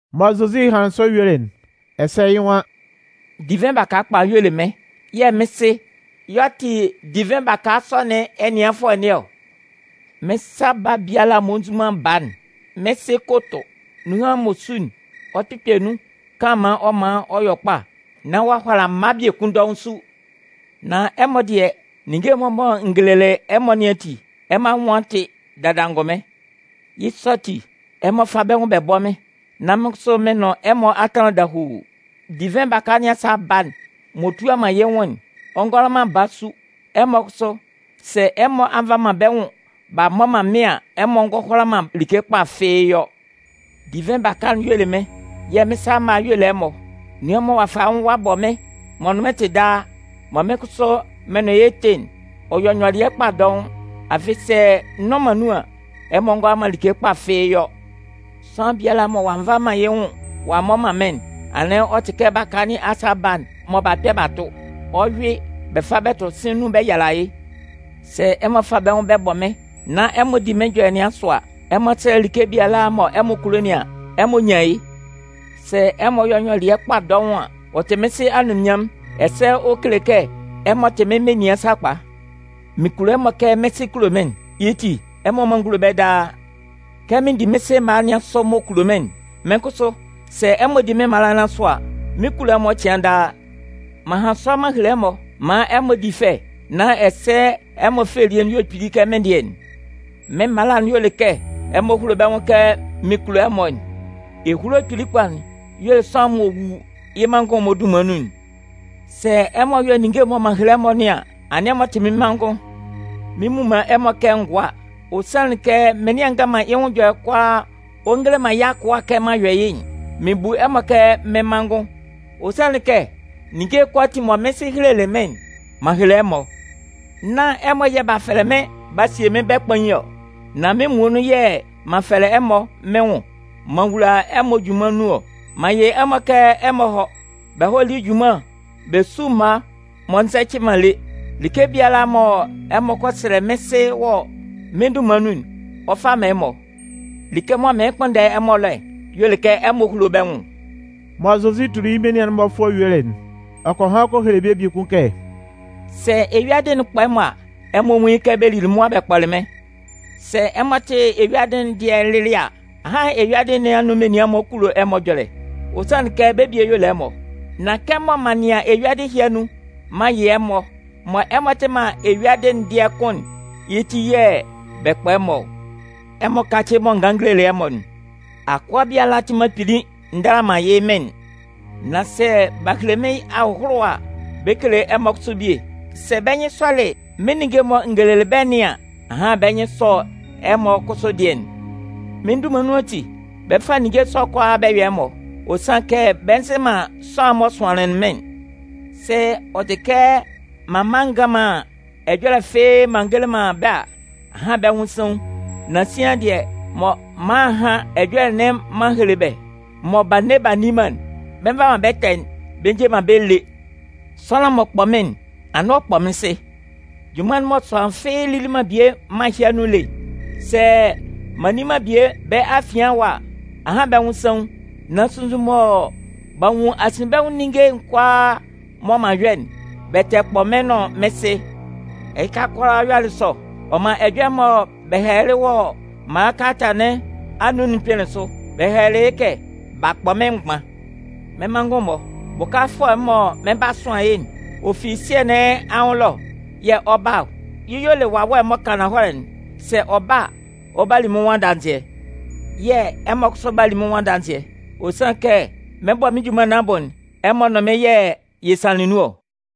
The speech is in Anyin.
Mɔ Zozi hanlɩn sɔ yuelɩ'n, ɛsɛ yɩ́ nwan: “Divɩn baka kpa'n y'ɔ le mɩ́n yɛ̂ mɩ́n Sɩ y'ɔ tɩ divɩn baka sɔ nɩn ɛnɩanfʋɛ nɩn ɔ. Mɩ́n sa baa biala m'ɔ nzu man baa'n, mɩ́n Sɩ 'ko tʋ. Nan nunhan m'ɔ su'n, ɔ kpɩkpɛ nun kanlanman ɔ man ɔ yɔ kpa, nán ɔ'a hʋala mma biekun dɔʋn su. Nan ɛmɔ dɩɛ, ninnge'n-mɔ mɔ n gelelɩ ɛmɔ nɩn ati, ɛmɔ anwʋn a tɩ dada angʋnmɩn. Yɩ́ sɔ ati, ɛmɔ fá bɛ́ nwʋn bɛ bɔ́ mɩ́n, nán mɩ́n kʋsʋ, mɩn nʋn ɛmɔ a tanlan dahuu. Divɩn baka nɩn asa baa'n m'ɔ tua man yɩ́ nwʋn'n, ɔ ngʋala man baa su. Ɛmɔ kʋsʋ, sɛ ɛmɔ a nva man bɛ́ nwʋn b'a mmɔ man mɩ́n an, ɛmɔ ngʋala man like kpa fɩ́ɩ́ yɔ. “Divɩn baka'n y'ɔ le mɩ́n, yɛ̂ mɩ́n sa mma'n-mɔ y'ɔ le ɛmɔ. Nunhan mɔ ɔ'a fa yɩ́ nwʋn ɔ'a bɔ mɩ́n, m'ɔ nʋn mɩ́n tɩ daa, mɔ mɩ́n kʋsʋ mɩn nʋn yɩ́ tɩ'n, ɔ 'yɔ nyɔlɩɛ kpa dɔʋn. Afɩ sɛ n nnʋn man nun an, ɛmɔ ngʋala man like kpa fɩ́ɩ́ yɔ. Sʋanlan biala mɔ ɔ'a nva man yɩ́ nwʋn ɔ'a mmɔ man mɩ́n'n, anɩn ɔ tɩ kɛ baka nɩn asa baa'n mɔ b'a kpɛ b'a tʋ. Ɔ 'yʋɩ bɛ fa bɛ tʋ sɩ̂n nun bɛ yala yɩ́. Sɛ ɛmɔ fa bɛ́ nwʋn bɛ bɔ mɩ́n, nán ɛmɔ di mɩ́n ɛjɔlɛ nɩn asʋ a, ɛmɔ sɛlɛ like biala mɔ ɛmɔ kulo nɩn an, ɛmɔ 'nyan yɩ́. Sɛ ɛmɔ yɔ nyɔlɩɛ kpa dɔʋn an, ɔ tɩ mɩ́n Sɩ anunminnyanmʋn ɛsɛ ɔ kele kɛ ɛmɔ tɩ mɩ́n menian sakpa. “Mɩn kulo ɛmɔ kɛ mɩ́n Sɩ kulo mɩ́n'n. Yɩ́ ti, ɛmɔ mán n gúlo bɛ́ daa. Kɛ mɩn di mɩ́n Sɩ mala nɩn asʋ m'ɔ kulo mɩ́n'n, mɩ́n kʋsʋ, sɛ ɛmɔ di mɩ́n mala nɩn asʋ a, mɩn 'kulo ɛmɔ cɩan daa. M'an han sɔ m'an hele ɛmɔ maan ɛmɔ di fɛ nán ɛsɛ ɛmɔ fɛ elie'n yɔ kpili kɛ mɩ́n dɩɛ'n. Mɩ́n mala'n y'ɔ le kɛ ɛmɔ húlo bɛ́ nwʋn kɛ mɩn kulo ɛmɔ'n. Ehulo kpili kpa'n y'ɔ le sʋanlan m'ɔ wu yɩ́ manngʋn'n-mɔ dunman nun'n. Sɛ ɛmɔ yɔ ninnge'n mɔ m'an hele ɛmɔ nɩn an, anɩn ɛmɔ tɩ mɩ́n manngʋn. Mɩn mmu man ɛmɔ kɛ mɩ́n ngʋa. Ɔ sanlɩn kɛ mɩnlɩan ngan man yɩ́ nwʋn ɛjɔlɛ kʋalaa ɔ ngele man yɩ́ akʋa kɛ m'an yɔ yɩ́'n. Mɩn bu ɛmɔ kɛ mɩ́n manngʋn. Ɔ sanlɩn kɛ ninnge'n kʋalaatin mɔ mɩ́n Sɩ helelɩ mɩ́n'n, m'an hele ɛmɔ. Nán ɛmɔ yɛ̂ b'a fɛlɛlɩ mɩ́n b'a sie mɩ́n bɛ́ kpain ɔ. Nan mɩ́n muonun yɛ̂ m'an fɛlɛ ɛmɔ mɩ́n nwʋn m'an wula ɛmɔ junman nun ɔ. M'an yɩ ɛmɔ kɛ ɛmɔ hɔ́, bɛ hɔ́ lí junman bɛ sú mma m'ɔ nzɛcɩ man lé. Like biala mɔ ɛmɔ kɔ sɛlɛ mɩ́n Sɩ wɔ mɩ́n dunman nun'n, ɔ 'fa man ɛmɔ. Like mɔ mɩɩn kpʋnndɛ ɛmɔ ɛlɔ'n y'ɔ le kɛ ɛmɔ húlo bɛ́ nwʋn.” Mɔ Zozi tuli yɩ́ menian'n-mɔ fʋɔ yuelɩ'n, ɔ kɔ han kɔ hele bɛ́ biekun kɛ: “Sɛ eyuadɩ'n kpɔ ɛmɔ a, ɛmɔ nwún yɩ́ kɛ bɛ lili mʋa bɛ kpɔlɩ mɩ́n. Sɛ ɛmɔ tɩ eyuadɩ'n dɩɛ lɩlɩ a, ahan eyuadɩ nɩn anun menian'n-mɔ kulo ɛmɔ ɛjɔlɛ, ɔ sanlɩn kɛ bɛ́ bie y'ɔ le ɛmɔ. Nan kɛmɔ m'an nɩan eyuadɩ nɩn anun m'an yɩ ɛmɔ, mɔ ɛmɔ tɩ man eyuadɩ'n dɩɛ kʋ́n'n, yɩ́ ti yɛ̂ bɛ kpɔ ɛmɔ ɔ. Ɛmɔ kácɩ mɔ n ganlɩn n gelelɩ ɛmɔ'n: ‘Akʋa biala tɩ man kpili ndala man yɩ́ mɩn'n’. Nan sɛ b'a hele mɩ́n ahʋlʋwa a, bɛ 'kele ɛmɔ kʋsʋ bie. Sɛ bɛ́ nyɩn sɔlɩ mɩ́n ninnge'n mɔ n gelelɩ bɛ́ nɩn an, ahan bɛ́ nyɩn 'sɔ ɛmɔ kʋsʋ dɩɛ'n. Mɩ́n dunman nun ati, bɛ 'fa ninnge sɔ'n kʋalaa bɛ yɔ ɛmɔ, ɔ sanlɩn kɛ bɛ nzɩ man sʋanlan'n m'ɔ sʋanlɩn mɩ́n'n. Sɛ ɔ tɩ kɛ m'an mma a ngan man ɛjɔlɛ fɩ́ɩ́ m'an ngele man bɛ́ a, ahan bɛ́ nwʋn saun. Nan sian dɩɛ, mɔ m'an a a han ɛjɔlɛ m'an hele bɛ́, mɔ b'a nne b'a nni man'n, bɛ nva man bɛ́ ɛtɛ'n bɛ nje man bɛ́ lé. Sʋanlan m'ɔ kpɔ mɩ́n'n, anɩn ɔ kpɔ mɩ́n Sɩ. Junman'n mɔ sʋanlan fɩ́ɩ́ lili man bie mân ɛhɩ anun lé'n, sɛ m'an nni man bie bɛ́ afian ɛwa a, ahan bɛ́ nwʋn saun. Nan sunnzun mɔ b'a nwun asinbɛnwʋn ninnge'n kʋalaa mɔ m'an yɔ'n, bɛ tɛ kpɔ mɩ́n nʋn mɩ́n Sɩ. Ɛhɩka kʋalaa yɔlɩ sɔ, ɔ man ɛjɔlɛ'n mɔ bɛ hɛlɛlɩ wɔ bɛ́ Mala kalata nɩn anun'n kpɩnlɩn sʋ. Bɛ hɛlɛlɩ yɩ́ kɛ: B'a kpɔ mɩ́n mgban. “Mɩ́n manngʋn-mɔ, Bʋkafʋɛ'n mɔ mɩn 'ba sʋan yɩ́'n, ɔ fi Sɩɛ nɩn anwʋn ɛlɔ yɛ̂ ɔ 'ba ɔ. Yɩ́ y'ɔ le Wawɛ'n mɔ kan ananhɔlɛ'n. Sɛ ɔ ba a, ɔ 'ba li mɩ́n nwʋn adanzɩɛ. Yɛ̂ ɛmɔ kʋsʋ 'ba li mɩ́n nwʋn adanzɩɛ, ɔ sanlɩn kɛ mɩn 'bɔ mɩ́n junman nɩn abʋ'n, ɛmɔ nʋn mɩ́n yɛ̂ yɛ sanlɩn nun ɔ.